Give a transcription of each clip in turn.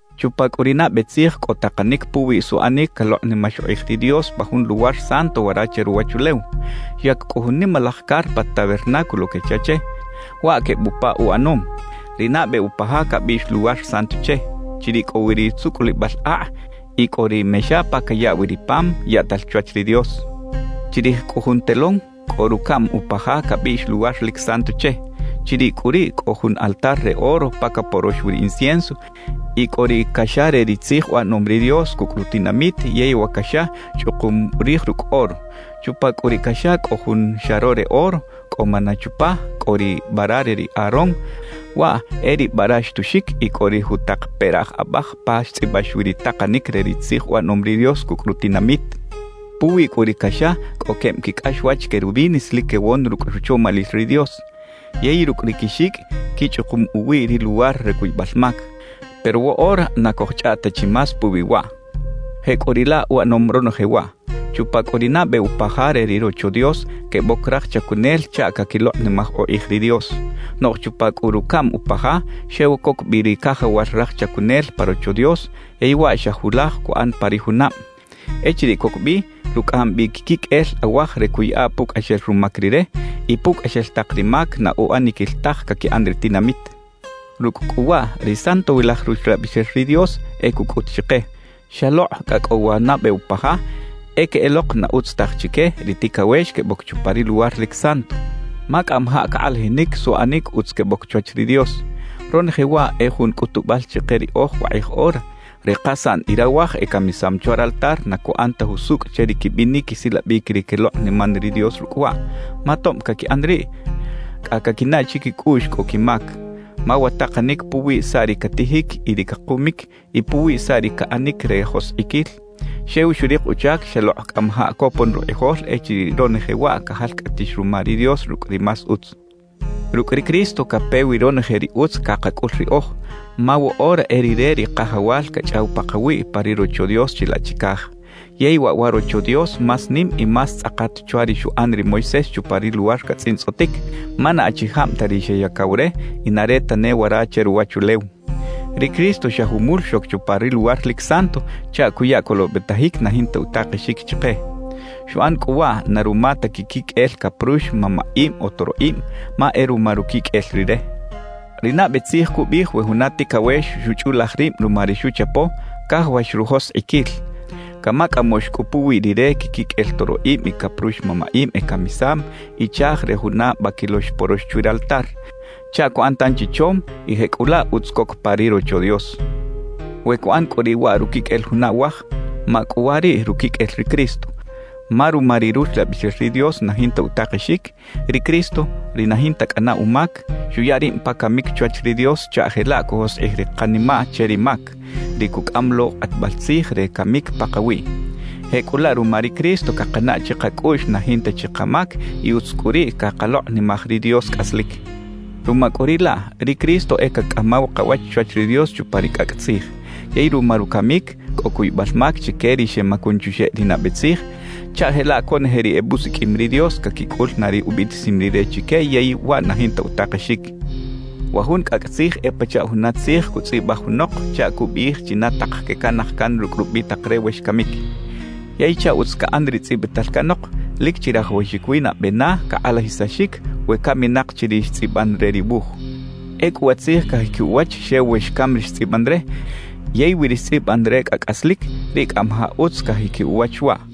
Chupa cꞌu ri nabe tzij cꞌo takanic puwiꞌ suꞌanic calokꞌnimax ukꞌij ri Dios pa jun luwar santo wara che ruwachulew. Xyac cꞌu jun nimalaj carpa “Tabernáculo” quecha che. Waꞌ queb upa uꞌanom. Ri nabe upa ja cabiꞌx “Luwar Santo” che. Chiriꞌ cꞌo wi ri tzucꞌulibal akꞌ y cꞌo ri mexa pa cayaꞌ wi ri pam yaꞌtal chwach ri Dios. Chirij cꞌu jun telón cꞌo rucaꞌm upa ja cabiꞌx “Luwar lic Santo” che. Chiriꞌ cꞌu riꞌ cꞌo jun altar re oro pa caporox wi incienso y cꞌo ri caxa re ri tzij uꞌanom ri Dios cucꞌ rutinamit yey wa caxa chꞌukum rij rucꞌ oro. Chupa cꞌu ri caxa cꞌo jun xaro re oro cꞌo maná chupa, cꞌo ri bara re ri Aarón, waꞌ e ri bara xtuxic y cꞌo ri jutak peraꞌj abaj pa xtzꞌibax wi ri takanic re ri tzij uꞌanom ri Dios cucꞌ rutinamit. Puwi cꞌu ri caxa cꞌo queb quicꞌaxwach querubines lic quewon rucꞌ ruchomalil ri Dios; yey rucꞌ ri quixicꞌ quichꞌukum uwiꞌ ri luwar re cuybal mac. Pero woꞌora na cojchꞌaꞌt ta chi más puwi waꞌ. Jecꞌuriꞌlaꞌ uꞌanom ronoje waꞌ. Chupa cꞌu ri nabe upa ja re ri Rocho Dios queboc raj chacunel chaꞌ caquilokꞌnimaj ukꞌij ri Dios. Noꞌj chupa cꞌu rucaꞌm upa ja, xew coc bi ri cajawal raj chacunel pa Rocho Dios, yey waꞌ xa julaj cuꞌan pa ri junab. Echiriꞌ coc bi, rucꞌaꞌam bi quiquiqꞌuel awaj re cuꞌyaꞌa pucꞌaxel rumac rire y pucꞌaxel tak ri mac na uꞌaniquil taj caquiꞌan ri tinamit. Rucꞌ cꞌu waꞌ ri Santowilaj Ruxlabixel ri Dios e cucꞌut chike: Xalokꞌ cꞌa cꞌo wa nabe upa ja, e queꞌelok na utz taj chique ri ticawex queboc chupa ri Luwar lic Santo, ma cꞌamajaꞌ cakꞌalajinic suꞌanic utz queboc chwach ri Dios. Ronoje waꞌ e jun cꞌutubal chike riꞌoj wakꞌij ora, ri kasaꞌn y rawaj ecamisam chwa raltar na cuꞌan ta jusucꞌ che ri quibinic quisilabic ri quelokꞌniman ri Dios rucꞌ waꞌ; ma tob caquiꞌan riꞌ, cꞌa caquinaꞌ chiquicꞌuꞌx cꞌo quimac. Ma wa takanic puwi saꞌ ri catijic y ri cakumic y puwi saꞌ ri caꞌanic re joskꞌiquil, xew xurik uchac xalokꞌ cꞌamajaꞌ copon rukꞌijol echiriꞌ ronoje waꞌ cajalcꞌatix ruma ri Dios rucꞌ ri más utz. Rucꞌ ri Cristo cape wi ronoje ri utz cakacꞌul riꞌoj, ma woꞌora e Rire ri Kajawal cachꞌaw pakawiꞌ pa ri Rocho Dios chilaꞌ chicaj. Yey waꞌ wa Rocho Dios más nim y más tzꞌakat chwa ri xuꞌan ri Moisés chupa ri luwar catzꞌintzꞌotic, ma na achijab ta ri xeyacaw re y na re tane wara che ruwachulew. Ri Cristo xa jumul xoc chupa ri Luwar lic Santo chaꞌ cuya colobetajic na jinta utakexic chike. Xuꞌan cꞌu waꞌ na ruma ta quiquiqꞌuel caprux mamaꞌib o toroꞌib, ma e ruma ruquiqꞌuel Rire. Ri nabe tzij cubiꞌij we juna ticawex xuchꞌulaj rib ruma ri xuchapo, cajawax rujoskꞌiquil; camacꞌamoꞌx cꞌu puwi rire quiquiqꞌuel toroꞌib y caprux mamaꞌib ecamisam y chaaj re juna baquilo xporox chwi raltar, chaꞌ cuꞌan tanchi chom y jecꞌulaꞌ utz coc pa ri Rocho Dios. We cuꞌan cꞌu riꞌ waꞌ ruquiqꞌuel juna awaj, ¡macꞌuwariꞌ ruquiqꞌuel ri Cristo! Ma ruma ri Ruxlabixel ri Dios na jinta utakexic, ri Cristo, ri na jinta cꞌana umac, xuya rib pa camic chwach ri Dios chaꞌ jelaꞌ cujoskꞌij ri kanimaꞌ che ri mac, ri cucꞌam lo kꞌatbal tzij re camic pakawiꞌ. Jecꞌulaꞌ ruma ri Cristo cakanaꞌ chikacꞌuꞌx na jinta chi kamac y utz cꞌu riꞌ cakalokꞌnimaj ri Dios cꞌaslic. Ruma cꞌu riꞌ laꞌ, ri Cristo e cacꞌamaw kawach chwach ri Dios chupa ri cꞌacꞌ tzij. Yey ruma rucamic, cꞌo cuybal mac chique ri xemacun chuxeꞌ ri nabe tzij, chaꞌ jelaꞌ conoje ri ebusiqꞌuim ri Dios caquicꞌul na ri ubiꞌtisim Rire chique yey waꞌ na jinta utakexic. Wa jun cꞌacꞌ tzij e pachaꞌ juna tzij cutzꞌibaj junok chaꞌ cubiꞌij china tak quecanaj can rucꞌ rubitak re we xcamic. Yey chaꞌ utz caꞌan ri tzꞌibital canok, lic chirajawaxic wi nabe na cakꞌalajisaxic we caminak chi ri xtzꞌiban re ri wuj. Ecꞌu wa tzij cajiquiꞌ uwach xew we xcam ri xtzꞌiban re, yey we ri xtzꞌiban re cꞌa cꞌaslic, riꞌ cꞌamajaꞌ utz cajiquiꞌ uwach waꞌ.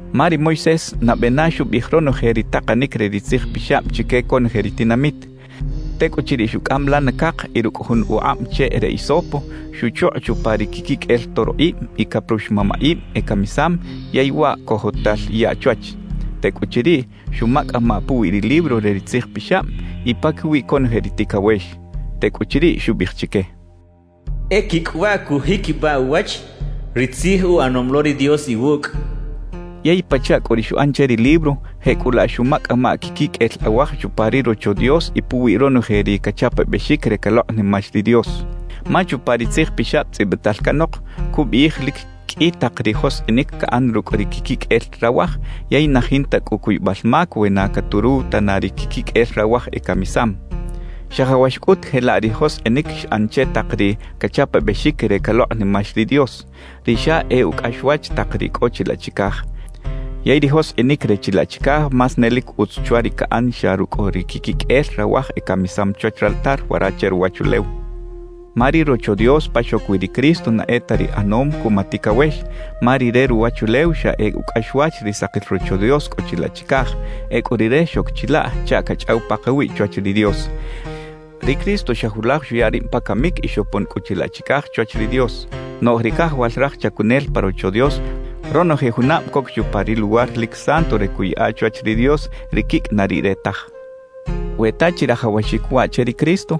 Ma ri Moisés nabe na xubiꞌij ronoje ri takanic re ri Tzij Pixab chique conoje ri tinamit; tecꞌuchiriꞌ xucꞌam lana cak y rucꞌ jun ukꞌab cheꞌ re hisopo, xuchukꞌ chupa ri quiquiqꞌuel toroꞌib y caprux mamaꞌib ecamisam yey waꞌ cojotal yaꞌ chwach. Tecꞌuchiriꞌ xumacꞌamaꞌ puwi ri libro re ri Tzij Pixab y paquiwi conoje ri ticawex. Tecꞌuchiriꞌ xubiꞌij chique: «E quicꞌ waꞌ cujiquibaꞌ uwach ri tzij uꞌanom lo ri Dios iwucꞌ» xchaꞌ. Yey pachaꞌ cꞌu ri xuꞌan che ri libro, jecꞌulaꞌ xumacꞌamaꞌ quiquiqꞌuel awaj chupa ri Rocho Dios y puwi ronoje ri cachapabexic re calokꞌnimax ri Dios. Ma chupa ri tzijpixab tzꞌibital canok, cubiꞌij lic qꞌui tak ri joskꞌinic caꞌan rucꞌ ri quiquiqꞌuel rawaj, yey na jinta cꞌu cuybal mac we na caturuw tana ri quiquiqꞌuel rawaj ecamisam. Xajawax cꞌut jelaꞌ ri joskꞌinic xꞌan che tak ri cachapabexic re calokꞌnimax ri Dios, ri xa e ucꞌaxwach tak ri cꞌo chilaꞌ chicaj. Yey ri joskꞌinic re chilaꞌ chicaj más ne lic utz chwa ri caꞌan xa rucꞌ ri quiquiqꞌuel rawaj ecamisam chwach raltar wara che ruwachulew. Ma ri Rocho Dios pa xoc wi ri Cristo na e ta ri ꞌanom cuma ticawex, ma ri re ruwachulew xa e ucꞌaxwach ri sakil Rocho Dios cꞌo chilaꞌ chicaj; ecꞌu Rire xoc chilaꞌ chaꞌ cachꞌaw pakawiꞌ chwach ri Dios. Ri Cristo xa julaj xuya rib pa camic y xopon cꞌu chilaꞌ chicaj chwach ri Dios. Noꞌj ri cajawal raj chacunel pa Rocho Dios ronoje junab coc chupa ri Luwar lic Santo re cuꞌyaꞌa chwach ri Dios ri quicꞌ na riꞌre taj. We ta chirajawaxic waꞌ che ri Cristo,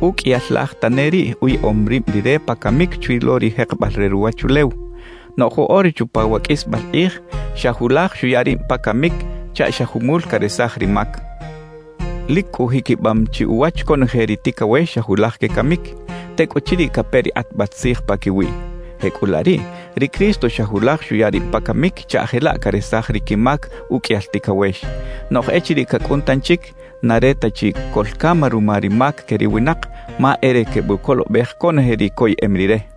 uqꞌuiyal laj tane riꞌ uyaꞌom rib Rire pa camic chwi lo ri jekebal re ruwachulew; noꞌj woꞌora chupa wa qꞌuisbal kꞌij xa julaj xuya rib pa camic chaꞌ xa jumul caresaj ri mac. Lic cꞌu jiquibam chi uwach conoje ri ticawex xa julaj quecamic, tecꞌuchiriꞌ cape ri kꞌatbal tzij paquiwiꞌ. Jecꞌulaꞌ riꞌ, ri Cristo xa julaj xuya rib pa camic chaꞌ jelaꞌ caresaj ri quimac uqꞌuiyal ticawex. Noꞌj echiriꞌ cacꞌun tanchic, na re ta chi coꞌlcam ruma ri mac que ri winak, ma e re quebucolobej conoje ri coyeꞌem Rire.